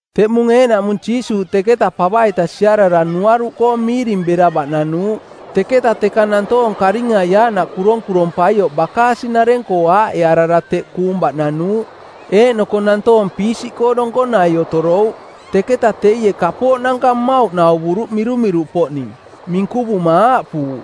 Teꞌmung eeꞌnaꞌmung Jiisuuꞌ teketa pava-ita siarara nuaruꞌkoo miiring bera baꞌnanuuꞌ. Teketa teka nantoong karingai aaꞌnaꞌ kuronkurompaioꞌ bakaasi-nareng-koo aaꞌearara teꞌ kuung baꞌnanuuꞌ eeꞌnoko nantoong piisiꞌkoo donkonai otorouꞌ. Teketa teie kapooꞌnanka mmauꞌ nauvuruꞌ mirumiruꞌpoꞌning. Minkuvuma aaꞌpuuꞌ,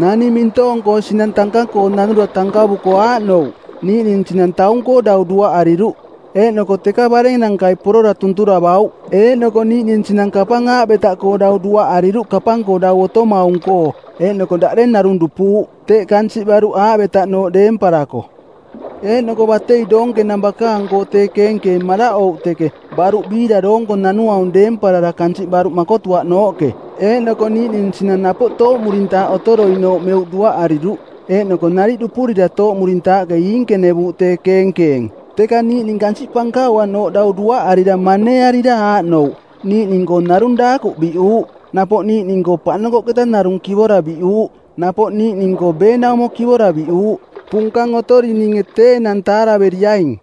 “Naning mintoong-koo sinang tanka-koo nanura tankavuko aaꞌnouꞌ: Niiꞌning sinang taung-koo dau duaꞌariruꞌ, eeꞌnoko teka barennankai porora tunturavauꞌ. Eeꞌnoko niiꞌning sinang kansiꞌ aavetaꞌkoo dau duaꞌariruꞌ kapang-koo dau otomaung-koo, eeꞌnoko daꞌdeng narung dupuuꞌ, teꞌ kansiꞌ baruꞌ aavetaꞌnooꞌ deemparako. Eeꞌnoko batei doonkenang bakaang-koo tee keenkeeng maraꞌouꞌ teke, baruꞌ biira doonko nanuaung deemparara kansiꞌ baruꞌ makotuaꞌnooꞌke. Eeꞌnoko niiꞌning sinang napoꞌ tooꞌmurintaaꞌ otoroinooꞌ meuꞌ duaꞌariruꞌ eeꞌnoko nariꞌ dupurira tooꞌmurintaaꞌke iinkenevuuꞌ tee keenkeeng. Teka niiꞌning kansiꞌ pankauanooꞌ dau duaꞌarira maneearira aaꞌnouꞌ: niiꞌning-koo narung daakuꞌ biꞌuuꞌ, napoꞌ niiꞌning-koo paꞌnokoꞌketa narung kivora biꞌuuꞌ, napoꞌ niiꞌning-koo beenaumo kivora biꞌuuꞌ. Punkang otorininge tee enang taaraveriaing!”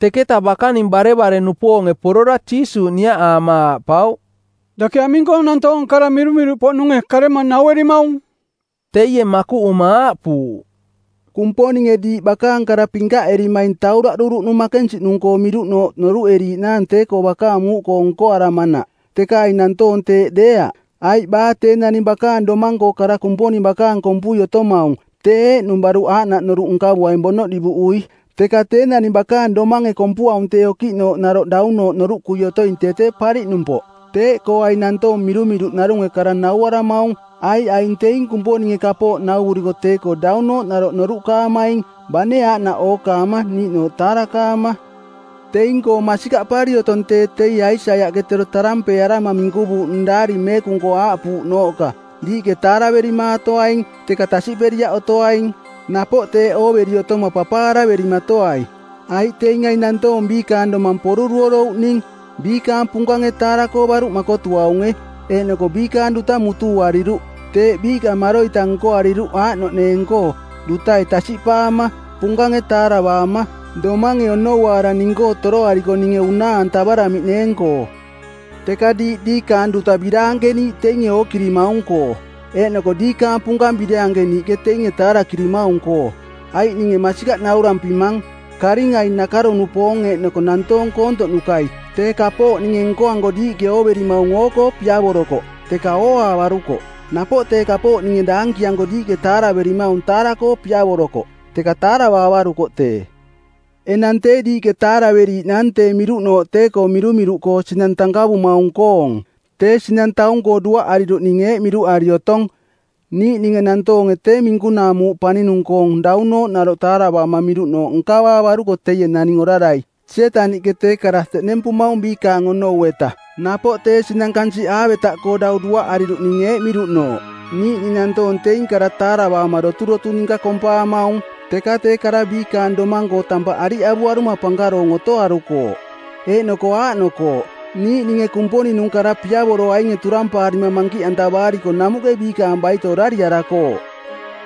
Teketa bakaning barevare-nupoonge porora Jiisuuꞌ niaꞌaama aaꞌpauꞌ, “Dake aming-koo nantoong kara mirumiruꞌpoꞌnunge karema nauerimaung?” Teie makuꞌuma aaꞌpuuꞌ, “Kumponinge diiꞌ bakaang kara pinkaꞌerimaing tauraꞌduruꞌnung makensiꞌnung-koo miruꞌnooꞌ noruꞌeriiꞌnaang tee-koo bakaang muuꞌkoo nkoaramanaꞌ, teka aing nantoong teeꞌ deeaꞌ. Aiꞌ baa tee naning bakaang domang-koo kara Kumponing bakaang kompui otomaung tee eeꞌnung baruꞌ aaꞌnaꞌ noruꞌ nkavuaing bonoꞌ divuꞌui, teka tee naning bakaang domange kompuaung tee okiꞌnooꞌ naroꞌ daunooꞌ noruꞌkui otoing tee tee pariꞌnumpoꞌ. Teeꞌkoo aing nantoong mirumiruꞌ narunge kara nauaramaung, aiꞌ aing teing Kumponinge kapooꞌ nauvuriko tee-koo daunooꞌ naroꞌ noruꞌkaamaing, bane aaꞌnaꞌ ookaama niiꞌnooꞌ taarakaama. Teing-koo masikaꞌpari otong tee teie Aisaiaꞌke tero tarampeearama minkuvuuꞌnung Daari Meekung-koo aaꞌpuuꞌnooꞌka, ‘Diiꞌke taaraverimaatoaing, teka tasiꞌperiaꞌ otoaing. Napoꞌ teeꞌ ooveri otoma papaaraverimatoai. “Aiꞌ teing aing nantoong biikaang domang poruruorouꞌning˜, biikaang punkange taara-koo baruꞌ makotuaunge eeꞌnoko biikaang duta mutuuariruꞌ. Teeꞌ biiꞌka maroita nkoariruꞌ aaꞌnoꞌneeng-koo, dutai tasiꞌpaama, punkange taaravaama, domange onouaara ning-koo toroariko ninge unaa-antavaramiꞌneeng-koo.’ “Teka diiꞌ diikaang duta biraankeniiꞌ teinge ookirimaung-koo, eeꞌnoko diikaang punkang biraankeniiꞌke teinge taarakirimaung-koo. Aiꞌ ninge masikaꞌ naurampimang, karingai-nakaro-nupoong eeꞌnoko nantoong koontoꞌnukai-tee kapooꞌ ninge nkoanko diiꞌke ooverimaung oo-koo piavorokoꞌ, teka ooaavarukoꞌ. Napoꞌ tee kapooꞌ ninge daankianko diiꞌke taaraverimaung taara-koo piavorokoꞌ, teka taaravaavarukoꞌ tee.” “Enang tee diiꞌke taaraveriiꞌnaang tee miruꞌnooꞌ tee-koo mirumiruꞌkoo sinang tankavumaung-koong. Tee sinang taung-koo duaꞌariruꞌning eeꞌ miruꞌari otong: Niiꞌninge nantoonge tee minkunaa muuꞌ paninung-koong daunooꞌ naroꞌ taaravaama miruꞌnooꞌ nkavaavaruko teie naning orarai, Sietaniꞌke tee kara teꞌnempumaung biikaang onou-eta. Napoꞌ tee sinang kansiꞌ aavetaꞌkoo dau duaꞌariruꞌning eeꞌ miruꞌnooꞌ: Niiꞌning nantoong teing kara taaravaama doturotu ninka kompaamaung. Teka tee kara biikaang domang-koo tampaꞌ ariꞌavuaruma pankaroong otoarukooꞌ. Eeꞌnoko aaꞌnokooꞌ: niiꞌninge Kumponing-nung kara piavoroainge turampaarima mankiꞌantavaariko namuꞌke biikaang baito orariarakooꞌ.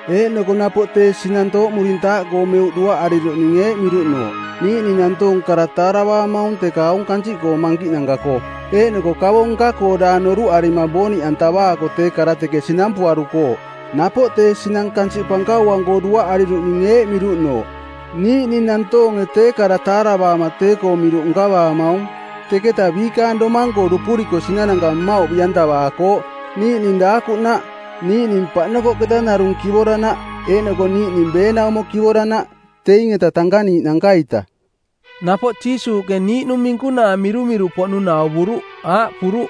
Eeꞌnoko napoꞌ tee sinang tooꞌmurintaaꞌkoo meuꞌ duaꞌariruꞌning eeꞌ miruꞌnooꞌ: Niiꞌning nantoong kara taaravaamaung teka aung kansiꞌkoong mankiꞌnanka-koo eeꞌnoko kavo nka-koo daang noruꞌarima booniꞌantavaako tee kara teke sinampuarukooꞌ. Napoꞌ tee sinang kansiꞌ pankauang-koo duaꞌariruꞌning eeꞌ miruꞌnooꞌ: Niiꞌning nantoonge tee kara taaravaama tee-koong miruꞌ nkavaamaung. Teketa biikaang domang-koo dupuriko sinananka mmauꞌ biꞌantavaakooꞌ, niiꞌning daakuꞌnaꞌ, niiꞌning paꞌnokoꞌketa narung kivoranaꞌ eeꞌnoko niiꞌning beenaumo kivoranaꞌ teing-eta tankaniiꞌnanka-ita.” Napoꞌ Jiisuuꞌke niiꞌnung minkunaa mirumiruꞌpoꞌnung nauvuruꞌ, aaꞌpuruꞌ,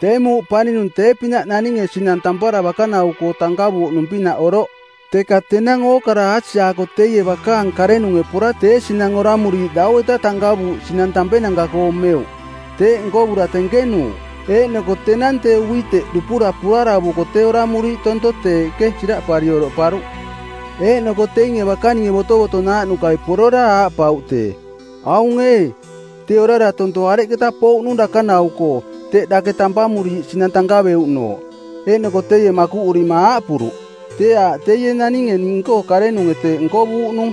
“Tee muuꞌ paninung tee-pinaꞌ naninge sinang tampara bakanau-koo tankavuuꞌnung-pinaꞌ oroꞌ. Teka tenang ookara aasiaako teie bakaang karenunge pora tee sinang oramuriiꞌ dau-eta tankavuuꞌ sinang tampenanka-koo meuꞌ. Teeꞌ nkovura tenkenuuꞌ. Eeꞌnoko tenang tee uiteꞌ dupura puaravuko tee oramuriiꞌ tonto teeꞌke siraꞌpari oroꞌparuꞌ. Eeꞌnoko teinge bakaninge botovotonaaꞌnukai porora aaꞌpauꞌ tee, ‘Aung ee, tee orara tonto areketa pouꞌnung dakanau-koo teꞌ dake tampamuriiꞌ sinang tankaveruꞌnooꞌ?’ Eeꞌnoko teie makuꞌurima aaꞌpuruꞌ, ‘Tee aaꞌ teie naninge ning-koo karenunge teeꞌ nkovuuꞌnung.’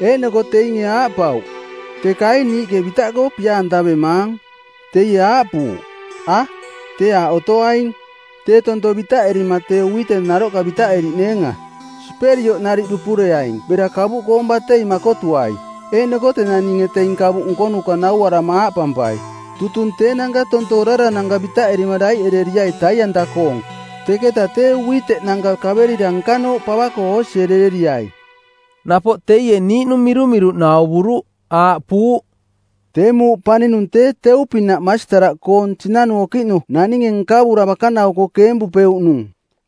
Eeꞌnoko teinge aaꞌpauꞌ, ‘Teka ee niiꞌke bitaꞌkoo pia-antavemaang?’ Teie aaꞌpuuꞌ, ‘A, tee aaꞌ otoaing. Tee tonto bitaꞌerima tee uiteꞌ naroꞌka bitaꞌeriꞌneenga. Siperioꞌ nariꞌ dupureaing bera kavuꞌkoong batei makotuai, eeꞌnoko tenang ninge teing kavuꞌ nkonuka nauarama aaꞌpampai, “Tutung teenanka tonto orarananka bitaꞌerima daiꞌereriai tai-anta-koong, teketa tee uiteꞌnanka kaverira nkanooꞌ pava-koo oosierereriai.’” ’ Napoꞌ teie niiꞌnung mirumiruꞌ nauvuruꞌ, aaꞌpuuꞌ, “Tee muuꞌ paninung tee teu-pinaꞌ masitaraꞌkoong sinanu okiꞌnu naninge nkavura bakanau-koo keempuuꞌnung.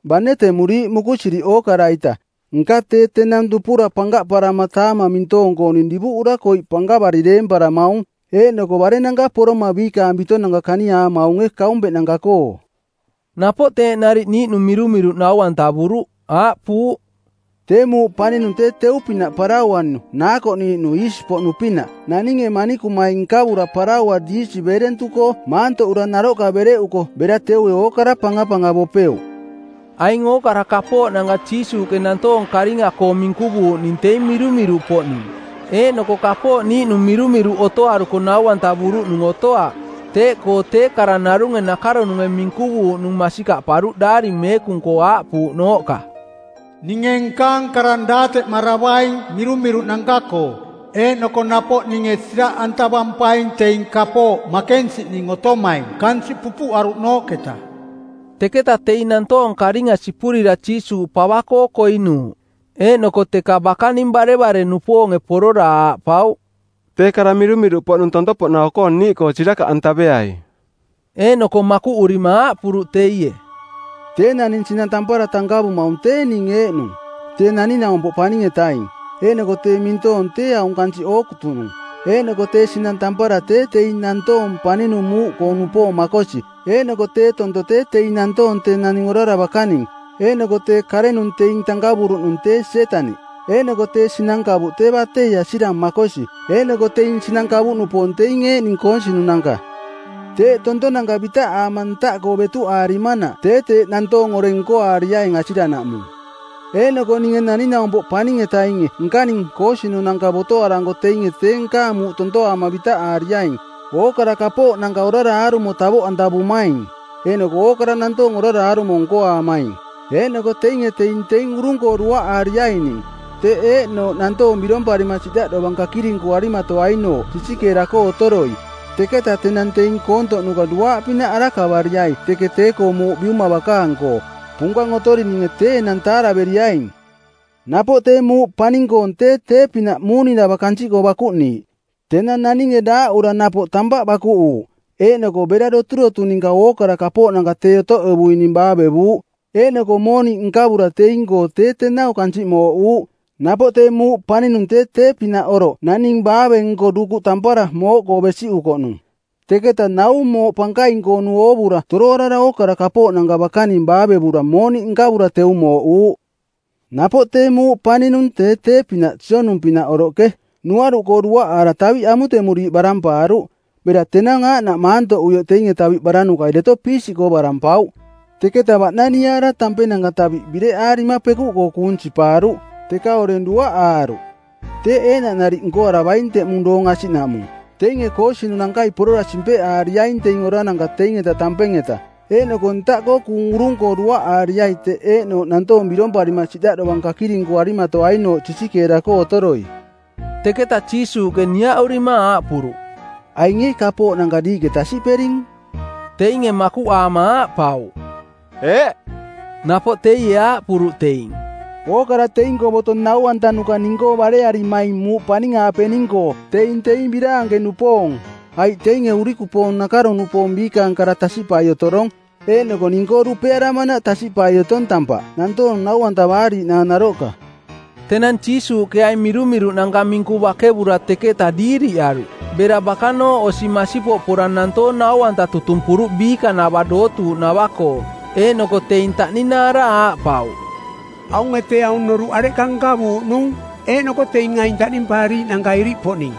Bane temuriiꞌ mukusiriꞌ ookara-ita, nka tee tenang dupura pankaꞌparama taamang mintoong-kooning divuꞌura koiꞌ pankavari deemparamaung, eeꞌnoko barennanka poroma biikaang bitonanka kaniaamaunge kaumpeꞌnanka-koo.” Napoꞌ teeꞌ nariꞌ niiꞌnung mirumiruꞌ nau-antavuruꞌ, aaꞌpuuꞌ, “Tee muuꞌ paninung tee teu-pinaꞌ parauanu naakoꞌniiꞌnu iisi-poꞌnu-pinaꞌ naninge manikumai nkavura paraua diisi beerentuꞌkoo maantoꞌura naroꞌka bereꞌuko bera teue ookara pangapangavopeuꞌ.” Aing ookara kapooꞌnanka Jiisuuꞌke nantoong karinga-koo minkuvuuꞌning teing mirumiruꞌpoꞌning, eeꞌnoko kapooꞌ niiꞌnung mirumiruꞌ otoaruko nau-antavuruꞌnung otoaꞌ. Teeꞌkoo tee kara narunge nakaronunge minkuvuuꞌnung masikaꞌparuꞌ Daari Meekung-koo aaꞌpuuꞌnooꞌka, “Ninge nkaang karang daateꞌmaravaing mirumiruꞌnanka-koo. Eeꞌnoko napoꞌ ninge siraꞌantavampaing teing kapooꞌ makensiꞌning otomaing kansiꞌ pupuꞌaruꞌnooꞌketa.” Teketa teing nantoong karinga sipurira Jiisuuꞌ pava-koo koinuuꞌ. Eeꞌnoko teka bakaning barevare-nupoonge porora aaꞌpauꞌ, “Tee kara mirumiruꞌpoꞌnung tonto-poꞌnau-koong niiꞌkoo sirakaꞌantaveai.” Eeꞌnoko makuꞌurima aaꞌpuruꞌ teie, “Tee naning sinang tampara tankavumaung tee ning eeꞌnung, Tee Naning-naumpoꞌ Paning-etaing. Eeꞌnoko tee mintoong tee aung kansiꞌ ookutunung, eeꞌnoko tee sinang tampara tee teing nantoong paninung muuꞌkoo-nupoong makosi. Eeꞌnoko tee tonto tee teing nantoong tee naning orara bakaning. Eeꞌnoko tee karenung teing tankavuruꞌnung tee Sietaniꞌ. Eeꞌnoko tee sinang kavuꞌ tee batei asirang makosi, eeꞌnoko teing sinang kavuꞌnupoong teing eeꞌning koosinunanka. Teeꞌ tontonanka bitaꞌaama ntaꞌkoo betuꞌaarimanaꞌ tee teeꞌ nantoong oreng nkoariaing asiranaꞌmung. Eeꞌnoko ninge Naning-naumpoꞌ Paning-etainge nkaning koosinunanka botoaranko teinge tee nkaang muuꞌ tontoaama bitaꞌaariaing, ookara kapooꞌnanka orara aarumo tavoꞌantavumaing eeꞌnoko ookara nantoong orara aarumo nkoaamaing. Eeꞌnoko teinge teing teing urung-koo duaꞌaariaining, teꞌ eeꞌnooꞌ nantoong biromparima siꞌdaꞌ dovang kakirinkuarimatoainooꞌ sisikeera-koo otoroi. Teketa tenang teing koontoꞌnuka duaaꞌpinaꞌ arakavariai teke tee-koo muuꞌ Biuma bakaang-koo. Punkang otorininge tee enang taaraveriaing!” “Napoꞌ tee muuꞌ paning-koong tee tee-pinaꞌ muuninava kansiꞌkoo bakuꞌniiꞌ. Tenang naninge daaꞌura napoꞌ tampaꞌ bakuꞌuuꞌ eeꞌnoko bera doturotu ninka ookara kapooꞌnanka tee otoꞌevukoꞌning baavevuuꞌ eeꞌnoko mooniꞌ nkavura teing-koo tee tenau kansiꞌ mooꞌuuꞌ. Napoꞌ tee muuꞌ paninung tee tee-pinaꞌ oroꞌ naning baave-nko dukuꞌ tampara mooꞌkoo besiꞌukoꞌnung. Teketa nau mooꞌ pankaing-koonu oovura toroarara ookara kapooꞌnanka bakaning baavevura mooniꞌ nkavura teu mooꞌuuꞌ.” “Napoꞌ tee muuꞌ paninung tee tee-pinaꞌ sionung-pinaꞌ oroꞌke. Nuaruꞌkoo duaꞌaara taviꞌ amutemuriiꞌ barampaaruꞌ. Bera tenang aaꞌnaꞌ maantoꞌuioꞌ teinge taviꞌ baranukai deto piisiꞌkoo barampauꞌ. Teketa baꞌnaniaara tampenanka taviꞌ bireꞌarima pekuꞌkoo kuung sipaaruꞌ, teka oreng duaꞌaaruꞌ. Teeꞌ eeꞌnaꞌ nariꞌ nkoaravaing teꞌmung doong asiꞌnaꞌmung. Teinge koosinunankai porora simpeꞌaariaing teing orananka teing-eta tampeng-eta. Eeꞌnoko ntaꞌkoo kuung urung-koo duaꞌaariai teꞌ eeꞌnooꞌ nantoong biromparima siꞌdaꞌ dovang kakirinkuarimatoainooꞌ sisikeera-koo otoroi.” Teketa Jiisuuꞌke niaꞌurima aaꞌpuruꞌ, “Aing ee kapooꞌnanka diiꞌke tasiꞌpering?” Teinge makuꞌaama aaꞌpauꞌ, “Eeꞌ”. Napoꞌ teie aaꞌpuruꞌ teing, “Ookara teing-koo boto nau-antanuka ning-koo barearimaing muuꞌ paning-aapening-koo teing teing biraanke-nupoong, aiꞌ teinge urikupoong nakaro-nupoong biikaang kara tasiꞌpai otorong eeꞌnoko ning-koo dupearamanaꞌ tasiꞌpai otong tampaꞌ nantoong nau-antavaariiꞌnaang naroꞌka.” Tenang Jiisuuꞌke aing mirumiruꞌnanka minku bakevura teketa diiriꞌaruꞌ. Bera bakanooꞌ osi masipoꞌ pora nantoong nau-anta tutumpuruꞌ biikanava dootuuꞌnava-koo. Eeꞌnoko teing taꞌninaara aaꞌpauꞌ, “Aunge tee aung noruꞌ areꞌka nkavuuꞌnung, eeꞌnoko teing aing taꞌnimpaariiꞌnanka iriꞌpoꞌning?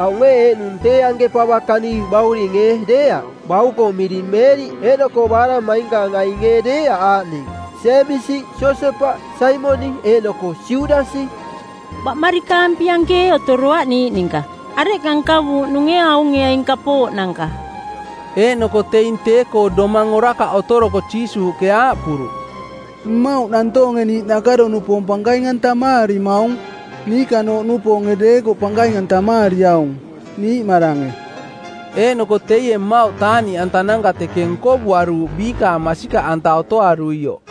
Aung ee eeꞌnung tee anke pava kani bauring ee deeaꞌ? Bauko miring Meeriꞌ eeꞌnoko baaraꞌmainkaang ainge ee deeaꞌ aaꞌning, Jeemisi, Josepaꞌ, Saimoniꞌ eeꞌnoko Judasi? Baꞌmarikaampi anke ee otoroaꞌ niiꞌ ninka? Areꞌka nkavuuꞌnunge aunge aing kapooꞌnanka?” Eeꞌnoko teing tee-koo domang orakaꞌ otoroko Jiisuuꞌke aaꞌpuruꞌ, “Mmauꞌ nantoonge niiꞌ nakaro-nupoong pankaing-antamaarimaung. Niikanooꞌnupoonge deekoꞌ pankaing-antamaariaung, niiꞌmarange.” Eeꞌnoko teie mmauꞌ taaꞌniꞌantananka teke nkovuaruuꞌ biikaang masikaꞌanta otoaruioꞌ.